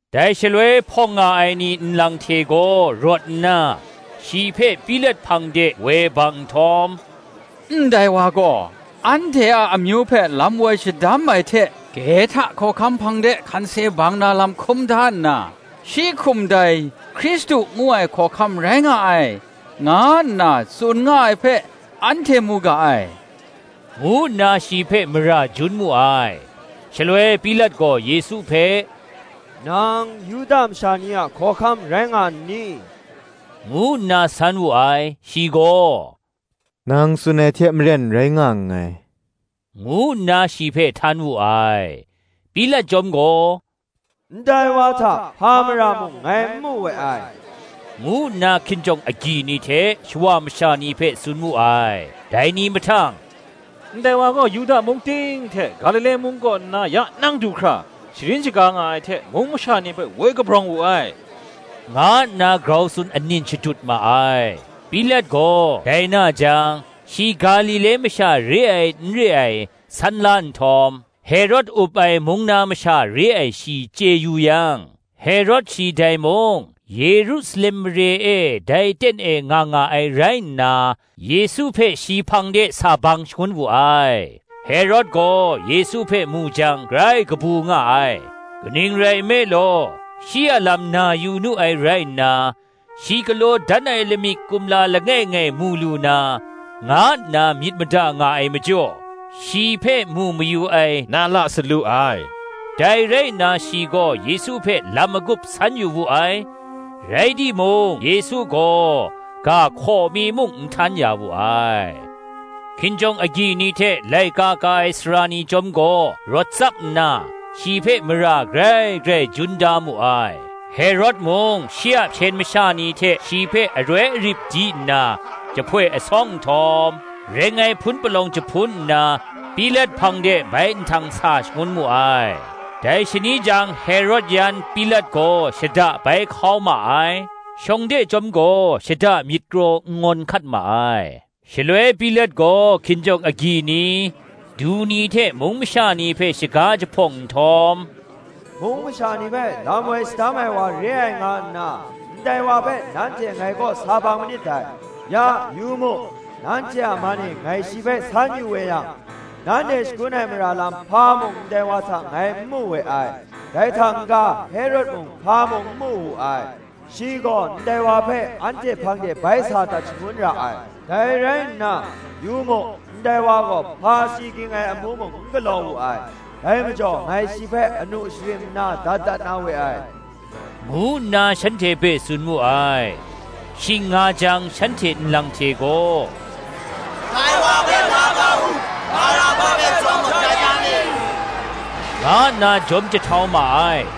Dai shaloi hpawng nga ai ni nlang hte gaw rawt nna, shi hpe Pilat hpang de woi bang nhtawm, “Ndai wa gaw anhte a amyu hpe lam woi shadam ai hte, Kehta hkawhkam hpang de hkansi bang na lam hkum da nna, shi hkum dai Hkristu ngu ai hkawhkam rai nga ai, nga nna tsun nga ai hpe, anhte mu ga ai,” ngu nna shi hpe mara jun mu ai. Shaloi Pilat gaw Yesu hpe, “Nang Yuda masha ni a hkawhkam rai nga n ni?” ngu nna san wu ai; shi gaw, “Nang tsun ai hte maren rai nga nngai,” ngu nna shi hpe htan wu ai. Pilat chyawm gaw, “Ndai wa hta hpa mara mung ngai n mu we ai,” ngu nna hkinjawng agyi ni hte shawa masha ni hpe tsun mu ai. Dai ni mahtang, “Ndai wa gaw Yuda mung ting hte, Galile mung kaw nna ya nang du hkra, sharin shaga nga ai hte, mung masha ni hpe woi kabrawng wu ai,” nga nna grau tsun anin shadut ma ai. Pilat gaw dai na jang, shi Galile masha re ai, n re ai, san la nhtawm, Herod up ai mung na masha re ai shi chye yu yang, Herod shi dai mung, Yerusalem mare e dai ten e nga nga ai rai nna, Yesu hpe shi hpang de sa bang shangun wu ai. Herod gaw Yesu hpe mu jang grai kabu nga ai: kaning rai nme law, shi a lam na yu nu ai rai nna, shi galaw dan ai lamik kumla langai ngai mu lu na, nga nna myit mada nga ai majaw, shi hpe mu mayu ai na la salu ai. Dai rai nna shi gaw Yesu hpe lam magup san yu wu ai, rai timung Yesu gaw, ga hkaw mi muk n htan ya wu ai. Hkinjawng agyi ni hte laika ka ai sara ni chyawm gaw rawt tsap nna, shi hpe mara grai grai jun da mu ai. Herod mung shi a hpyen masha ni hte shi hpe aroi arip di nna, jahpoi asawng nhtawm, reng ai hpun palawng jahpun nna, Pilat hpang de bai nhtang sa shangun mu ai. Dai shani jang Herod yan Pilat gaw shada bai hkau ma ai: shawng de chyawm gaw shada myit kraw n ngawn hkat ma ai. Shaloi Pilat gaw hkinjawng agyi ni, du ni hte mung masha ni hpe shaga jahpawng nhtawm, “Mung masha ni hpe lam woi shadam ai wa re ai nga nna, ndai wa hpe nanhte ngai kaw sa bang manit dai: ya, yu mu, nanhte a man e ngai shi hpe san yu we yang, nanhte shagun ai mara lam hpa mung ndai wa hta ngai n mu we ai: dai hta n-ga Herod mung hpa mung n mu wu ai: shi gaw ndai wa hpe anhte hpang de bai sa dat shangun ra ai: dai rai nna, yu mu, ndai wa gaw hpa si ging ai amu mung n galaw wu ai; dai majaw ngai shi hpe anu sharim nna dat dat na we ai,” ngu nna shanhte hpe tsun mu ai. Shing nga jang shanhte nlang hte gaw, “Dai wa hpe la kau u, Baraba hpe chyawm gaw dat ya mi,” nga nna jawm jahtau ma ai: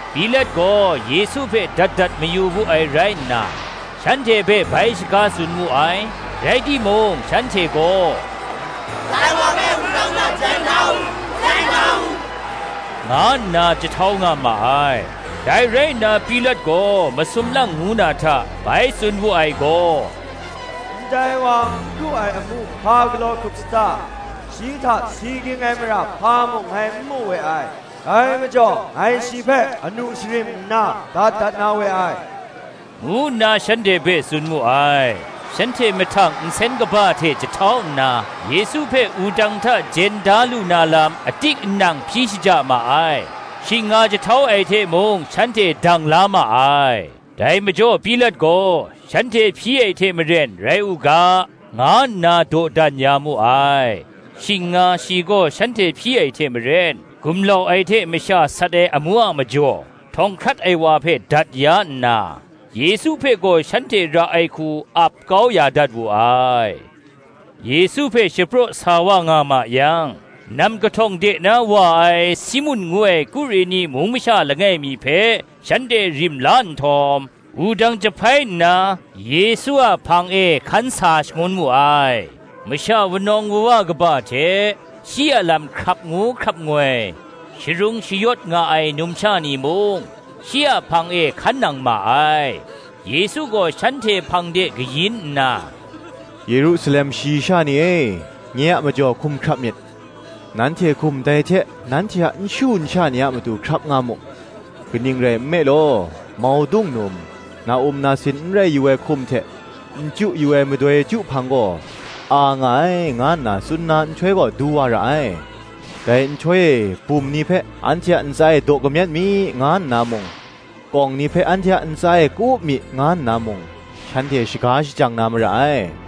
Pilat gaw Yesu hpe dat dat mayu wu ai rai nna, shanhte hpe bai shaga tsun mu ai: rai timung shanhte gaw, “Dai wa hpe wudang hta jen da u, jen da u,” nga nna jahtau nga ma ai. Dai rai nna Pilat gaw masum lang ngu na hta, bai tsun wu ai gaw, “Ndai wa n hkru ai amu hpa galaw hkrup sata? shi hta si ging ai mara hpa mung ngai n mu we ai: dai majaw ngai shi hpe anu sharim nna dat dat na we ai,” ngu nna shanhte hpe tsun mu ai. Shanhte mahtang nsen kaba hte jahtau nna, Yesu hpe wudang hta jen da lu na lam atik anang hpyi shaja ma ai: shing nga jahtau ai hte mung shanhte dang la ma ai. Dai majaw Pilat gaw, shanhte hpyi ai hte maren rai u ga, nga nna dawdan ya mu ai. Shing nga shi gaw shanhte hpyi ai hte maren, gumlau ai hte masha sat ai amu a majaw, htawng hkrat ai wa hpe dat ya nna, Yesu hpe gaw shanhte ra ai hku ap kau ya dat wu ai. Yesu hpe shapraw sa wa nga ma yang, nam kahtawng de na wa ai Simun ngu ai Kureni mung masha langai mi hpe shanhte rim la nhtawm, wudang jahpai nna, Yesu a hpang e hkan sa shangun mu ai. Masha wunawng wuwa kaba hte, shi a lam hkrap ngu hkrap ngoi, sharung shayawt nga ai numsha ni mung, shi a hpang e hkan nang ma ai. Yesu gaw shanhte hpang de kayin nna, “Yerusalem shayi sha ni e, nye a majaw hkum hkrap myit: nanhte hkum dai hte, nanhte a nshu nsha ni a matu hkrap nga mu: kaning rai nme law, Maudung num, na-um nasin n rai yu ai hkum hte, n chyu yu ai madoi chyu hpang gaw a nga ai, nga nna tsun na nhtoi gaw du wa ra ai. Dai nhtoi e, bum ni hpe, Anhte a ntsa e daw kamyet mi, nga nna mung, kawng ni hpe, Anhte a ntsa e ka-up mi, nga nna mung, shanhte shaga shajang na mara ai: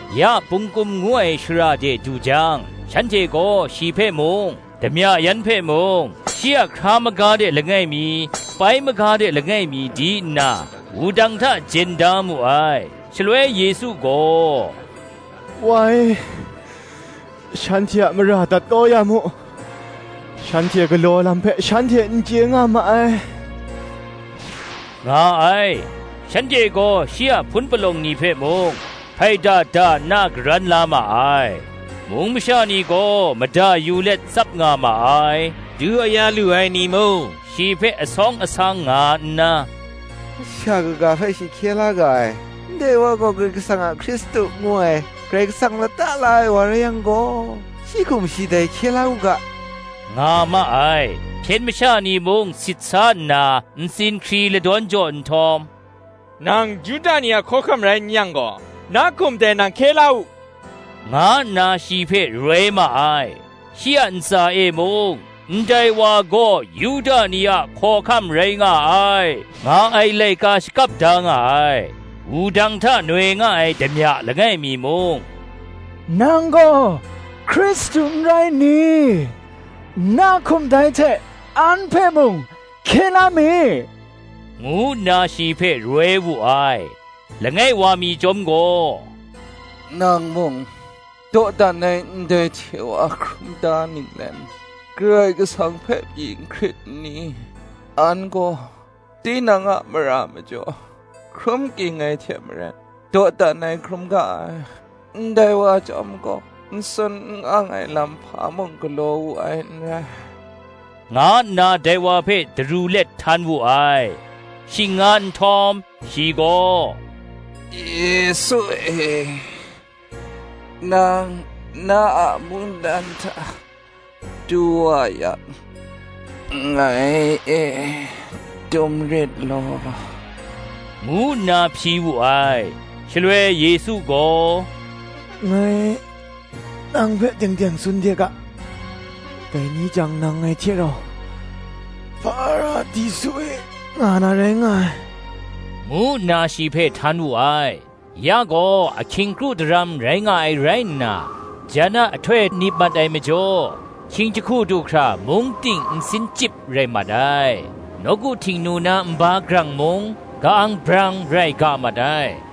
Ya Pungkum ngu ai shara de du jang, shanhte gaw shi hpe mung, damya yan hpe mung, shi a hkra maga de langai mi, pai maga de langai mi di nna, wudang hta jen da mu ai. Shaloi Yesu gaw, “Wa e, shanhte a mara dat kau ya mu: shanhte galaw ai lam hpe shanhte n chye nga ma ai,” nga ai. Shanhte gaw shi a hpun palawng ni hpe mung, hpaida da nna karan la ma ai. Mung masha ni gaw mada yu let tsap nga ma ai. Du aya lu ai ni mung shi hpe asawng asang nga nna, “Masha kaga hpe shi hkye la ga ai; ndai wa gaw Karai Kasang a Hkristu ngu ai, Karai Kasang lata la ai wa rai yang gaw, shi hkum dai shi hkye la u ga,” nga ma ai. Hpyen masha ni mung sit sa nna, ntsin hkri ladawn jaw nhtawm, “Nang Yuda ni a hkawhkam rai n yang gaw, na hkum dai nang hkye la u,” nga nna shi hpe roi ma ai. Shi a ntsa e mung ‘Ndai wa gaw Yuda ni a hkawhkam rai nga ai,’ nga ai laika shakap da nga ai. Wudang hta noi nga ai damya langai mi mung, “Nang gaw Hkristu n rai n ni? na hkum dai hte an hpe mung hkye la mi,” ngu nna shi hpe roi wu ai. Langai wa mi chyawm gaw, “Nang mung dawdan ai ndai hte wa hkrum da ninglen, Karai Kasang hpe pyi n hkrit n ni? An gaw tinang a mara majaw hkrum ging ai hte maren dawdan ai hkrum ga ai: ndai wa chyawm gaw n sun n ang ai lam hpa mung galaw wu ai n rai,” nga nna dai wa hpe daru let htan wu ai. Shing nga nhtawm, shi gaw, “Yesu e, nang na a mungdan hta du wa yang, ngai e dum rit law,” ngu nna hpyi wu ai. Shaloi Yesu gaw, “Ngai nang hpe teng teng tsun de ga, Dai ni jang nang ngai hte rau Hparadisu e nga na rai nga ai,” ngu nna shi hpe htan wu ai. Ya gaw ahkying kru daram rai nga ai rai nna, jan a ahtoi nip mat ai majaw, hkying jahku du hkra mung ting nsin chyip rai mat ai; nawku Htingnu na nba grang mung, ka-ang brang rai ga mat ai.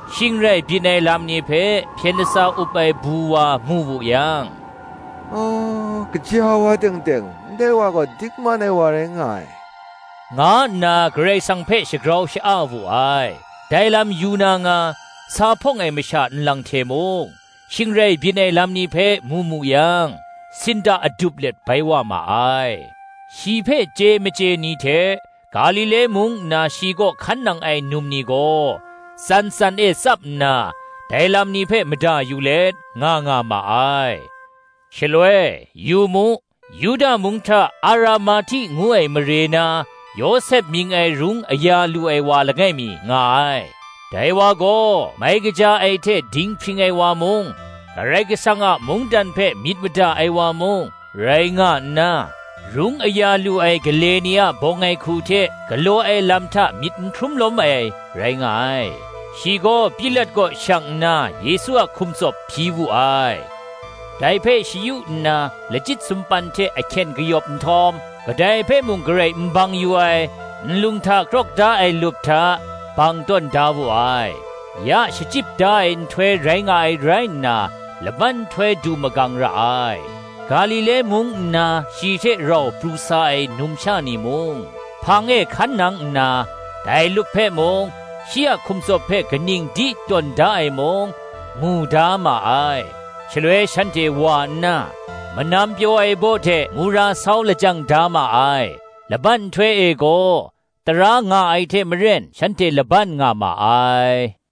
Shing rai byin ai lam ni hpe hpyen latsa up ai bu wa mu wu yang, “Gaja wa teng teng ndai wa gaw dingman ai wa rai nga ai,” nga nna Karai Kasang hpe shagrau sha-a wu ai. Dai lam yu na nga, sa hpawng ai masha nlang hte mung, shing rai byin ai lam ni hpe mu mu yang, sinda adup let bai wa ma ai. Shi hpe chye machye ni hte, Galile mung nna shi kaw hkan nang ai num ni gaw, tsan tsan e tsap nna, dai lam ni hpe mada yu let, nga nga ma ai. Shaloi, yu mu, Yuda mung hta Aramahti ngu ai mare na, Yawsep mying ai rung aya lu ai wa langai mi nga ai: dai wa gaw mai kaja ai hte dinghpring ai wa mung, Karai Kasang a mungdan hpe myit mada ai wa mung, rai nga nna, rung aya lu ai gale ni a bawng ai hku hte galaw ai lam hta myit n hkrum lawm ai, rai nga ai: shi gaw Pilat kaw shang nna Yesu a hkum tsawp hpyi wu ai. Dai hpe shayu nna, lachyit sumpan hte ahkyen kayawp nhtawm, kadai hpe mung garai n bang yu ai, nlung hta krawk da ai lup hta, bang tawn da wu ai. Ya Shachyip da ai nhtoi rai nga ai rai nna, laban nhtoi du magang ra ai. Galile mung nna shi hte rau pru sa ai numsha ni mung, hpang e hkan nang nna, dai lup hpe mung, shi a hkum tsawp hpe kaning di tawn da ai mung, mu da ma ai. Shaloi shanhte wa nna, manam pyaw ai baw hte mura sau lajang da ma ai. Laban nhtoi e gaw, tara nga ai hte maren shanhte laban nga ma ai.